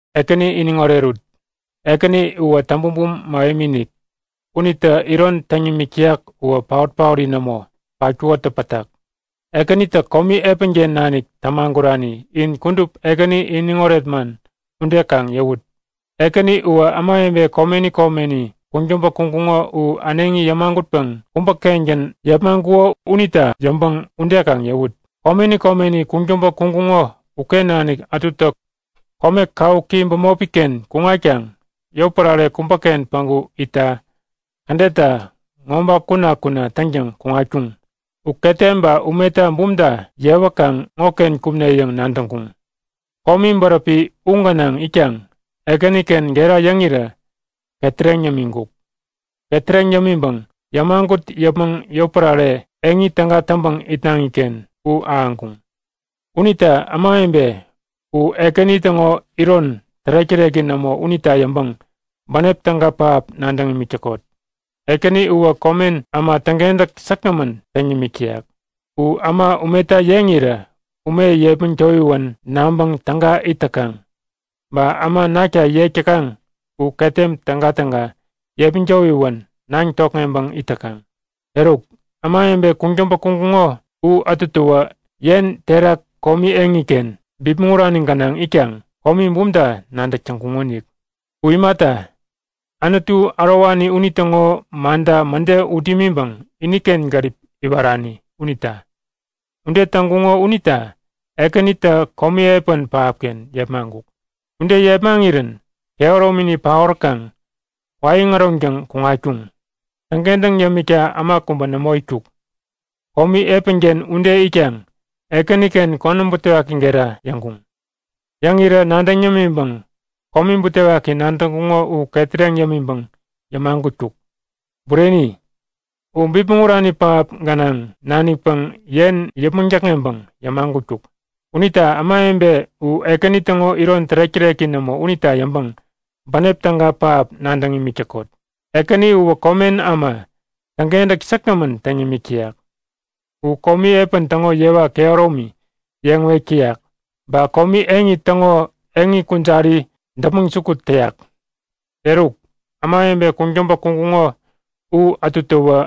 Ekäni iniŋ orerut! Uwä täŋ-bumbum mähemi-inik. Unitä iron täŋ nimik täyak uwä paot-paori nämo patkukotä pätak. Ekänitä komi epänken nanik tämagurani in kudup Ekäni iniŋoret man ude kaŋ yäwut. Ekäni uwä ämawebe komeni komeni kuŋtäŋpä kuŋkuŋo u äneŋi yämagutpäŋ kubäkengän yepmaŋkuko unita yäŋpäŋ ude kaŋ yäwut! Komeni komeni kuŋtäŋpä kuŋkuŋo uken nanik ätutä kome kawuki bämopiken kuŋatkaŋ yotpärare kubäken päŋku itta kädetta ŋoba kuna-kuna täŋtäŋ kuŋatkuŋ. U ketem ba umeta bumta yewäkaŋ ŋoken kumne yäŋ nadäŋkuŋ. Komi bäräpi u gänaŋ itkaŋ Ekäniken gera yäŋirä ketäreŋ yämiŋkuk. Ketäreŋ yämiŋpäŋ yämagut yäpmäŋ yotpärare eŋi täga täŋpäŋ itnaŋiken u ahäŋkuŋ. Unita ämawebe u Ekäni täŋo iron tärek-täreki nämo unita yäŋpäŋ bänep täga pähap nadäŋ imik täkot. Ekäni uwä komen äma täŋkentäk säkgämän täŋ yämik täyak. U äma umeta yeŋirä ume yepmäŋ towiwän naŋpäŋ täga it täkaŋ. Ba äma nakta yek täkaŋ u ketem tägatäga yepmäŋ towiwän naŋ tokŋeŋpäŋ it täkaŋ. Eruk, ämawebe kuŋtäŋpä kuŋkuŋo u ätutäwä yen terak komi eŋiken bipmäŋ urani gänaŋ itkaŋ komi bumta nadäk täŋkuŋonik. U imata, Anutu ärowani unitäŋo manta mäde ut imiŋpäŋ iniken gärip iwarani unita. Ude täŋkuŋo unita Ekänitä komi epän pähapken yepmaŋkuk. Ude yepmaŋirän kehäromini paoräkaŋ kwaiŋ äroŋtäŋ kuŋatkuŋ. Täŋkentäŋ yämikta äma kubä nämo itkuk. Komi epänken ude itkaŋ Ekäniken konäm butewaki gera yäŋkuŋ. Yäŋirä nadäŋ yämiŋpäŋ komi butewaki nadäŋkuŋo u ketäreŋ yämiŋpäŋ yämagutkuk. Bureni, u bipmäŋ urani pähap gänaŋ nanikpäŋ yen yäpmäŋ däkŋeŋpäŋ yämagutkuk. Unita ämawebe u Ekäni täŋo iron tärek-täreki nämo unita yäŋpäŋ bänep täga pähap nadäŋ imik täkot. Ekäni uwä komen äma täŋkentäk säkgämän täŋ yämik täyak. U komi epän täŋo yewa kehäromi yeŋ wek täyak. Ba komi eŋi täŋo eŋi kujari däpmäŋ jukut täyak. Eruk, ämawebe kuŋtäŋpä kuŋkuŋo u ätutäwä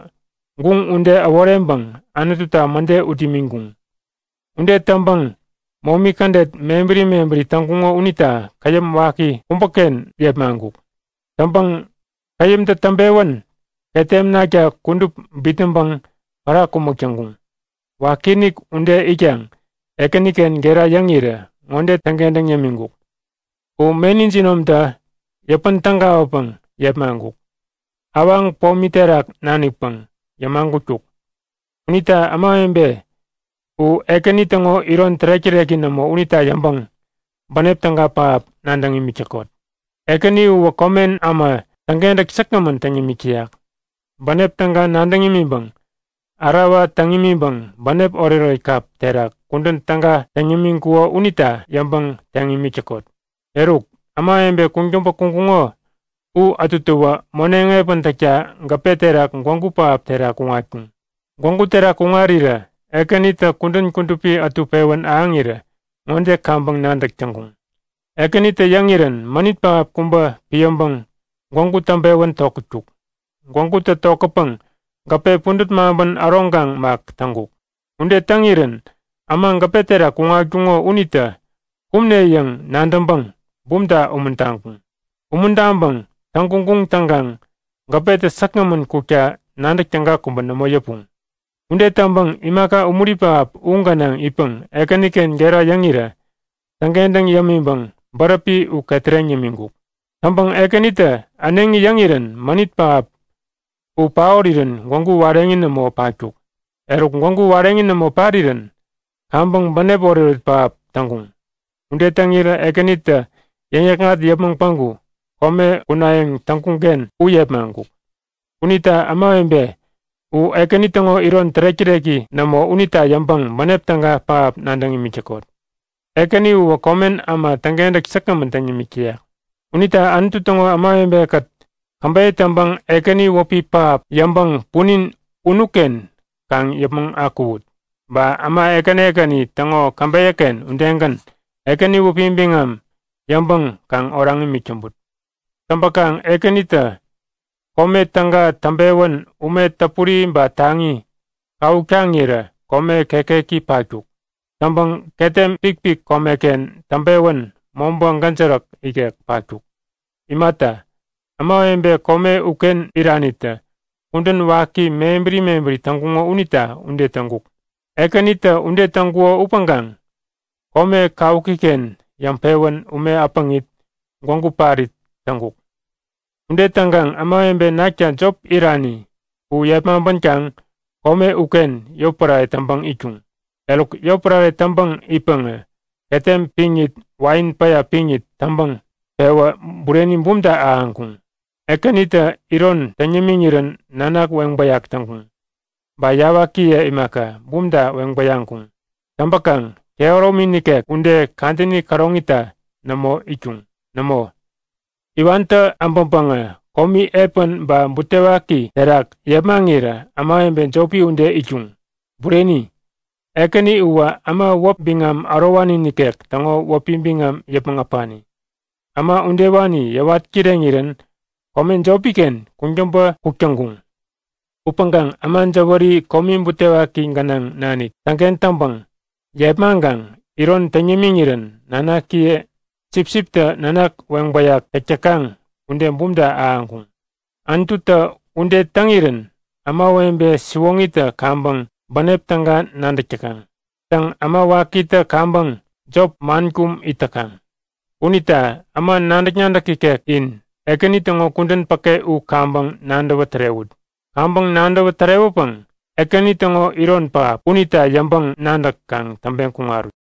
guŋ ude äworeŋpäŋ Anututa mäde ut imiŋkuŋ. Ude täŋpäŋ momi kädet mebäri mebäri täŋkuŋo unita käyäm waki kubäken yepmaŋkuk. Täŋpäŋ käyämtä täŋpewän ketem nakta kudup bitnäŋpäŋ pära kumäk täŋkuŋ. Wakiinik ude itkaŋ Ekäniken gera yäŋirä ŋode täŋkentäŋ yämiŋkuk; U meni jinomtä yäpän tägawäpäŋ yepmaŋkuk. Awaŋ pomi terak nanikpäŋ yämagutkuk. Unita ämawebe u Ekäni täŋo iron tärek-täreki nämo unita yäŋpäŋ bänep täga pähap nadäŋ imik täkot. Ekäni uwä komen äma täŋkentäk säkgämän täŋ yämik täyak. Bänep täga nadäŋ imiŋpäŋ ärawa täŋ imiŋpäŋ bänep oretoret kap terak kudän täga täŋ yämiŋkuko unita yäŋpäŋ teŋ imik täkot. Eruk, ämawebe kuŋtäŋpä kuŋkuŋo u ätutäwä moneŋ epän täkta gäpe terak gwägu pähap terak kuŋatkuŋ. Gwägu terak kuŋarirä Ekänitä kudän kudupi ätu pewän ahäŋirä ŋode kaŋpäŋ nadäk täŋkuŋ; Ekänitä yäŋirän mänit pähap kubä piäŋpäŋ gwägu täŋpewän tokätkuk. Gwägutä tokätpäŋ gäpe pudät maŋpän äroŋkaŋ mak täŋkuk. Ude täŋirän äma gäpe terak kuŋatkuŋo unitä kumne yäŋ nadäŋpäŋ bumta umuntaŋkuŋ. Umuntaŋpäŋ täŋguŋguŋ täŋkaŋ gäpetä säkgämän kukta nadäk täga kubä nämo yäpuŋ. Ude täŋpäŋ imaka umuri pähap u gänaŋ itpäŋ Ekäniken gera yäŋirä täŋkentäŋ yämiŋpäŋ bäräpi u ketäreŋ yämiŋkuk. Täŋpäŋ Ekänitä äneŋi yäŋirän mänit pähap u paorirän gwägu wareŋi nämo patkuk. Eruk gwägu wareŋi nämo parirän kaŋpäŋ bänep oretoret pähap täŋkuŋ. Ude täŋirä Ekänitä yäŋ-yäkŋat yäpmäŋ päŋku kome kunayäŋ nadäŋkuŋken u yepmaŋkuk. Unita ämawebe u Ekäni täŋo iron tärek-täreki nämo unita yäŋpäŋ bänep täga pähap nadäŋ imik täkot. Ekäni uwä komen äma täŋkentäk säkgämän täŋ yämik täyak. Unita Anutu täŋo ämawebekät käbeyä täŋpäŋ Ekäni wäpi pähap yäŋpäŋ punin unuken kaŋ yäpmäŋ akuwut! Ba äma ekäni ekäni täŋo käbeyäken udegän Ekäni wäpi biŋam yäŋpäŋ kaŋ oraŋ imik täŋput. Täŋpäkaŋ Ekänitä kome täga täŋpewän ume täpuri ba taŋi kawuk taŋirä kome kekeki patkuk. Täŋpäŋ ketem pikpik komeken täŋpewän mobä gäjäräk ikek patkuk. Imata, ämawebe kome uken iranitä kudän waki mebäri mebäri täŋkuŋo unita ude täŋkuk. Ekänitä ude täŋkuko upäŋkaŋ kome kawukiken yäŋpewän ume äpäŋit, gwägu parit täŋkuk. Ude täŋkaŋ ämawebe nakta jop irani u yepmaŋpänkaŋ kome uken yotpärare täŋpäŋ itkuŋ. Eruk yotpärare täŋpäŋ itpäŋä ketem piŋit wain päya piŋit täŋpäŋ pewä bureni bumta ahäŋkuŋ. Ekänitä iron täŋ yämiŋirän nanak weŋbäyak täŋkuŋ. Ba yawakiye imaka, bumta weŋbäyaŋkuŋ. Täŋpäkaŋ kehäromi nikek ude kadäni käroŋita nämo itkuŋ. Nämo, iwantä abäŋpäŋä komi epän ba butewaki terak yepmaŋirä ämawebe jopi ude itkuŋ. Bureni, Ekäni uwä äma wäp biŋam ärowani nikek täŋo wäpi biŋam yäpmäŋ äpani. Äma udewani yäwat kireŋirän kome jopiken kuŋtäŋpä kuk täŋkuŋ. Upäŋkaŋ äma jäwäri komi butewaki gänaŋ nanik täŋken täŋpäŋ yepmaŋkaŋ iron täŋ yämiŋirän nanakiye sipsiptä nanak weŋbäyak täk täkaŋ ude bumta ahäŋkuŋ. Anututä ude täŋirän ämawebe siwoŋitä kaŋpäŋ bänep täga nadäk täkaŋ. Täŋ äma wakitä kaŋpäŋ jop, man kum it täkaŋ. Unita äma nadäk-nadäk ikek in Ekäni täŋo kudän päke u kaŋpäŋ nadäwä tärewut. Kaŋpäŋ nadäwä tärewäpäŋ Ekäni täŋo iron pähap unita yäŋpäŋ-nadäk kaŋ täŋpeŋ kuŋarut.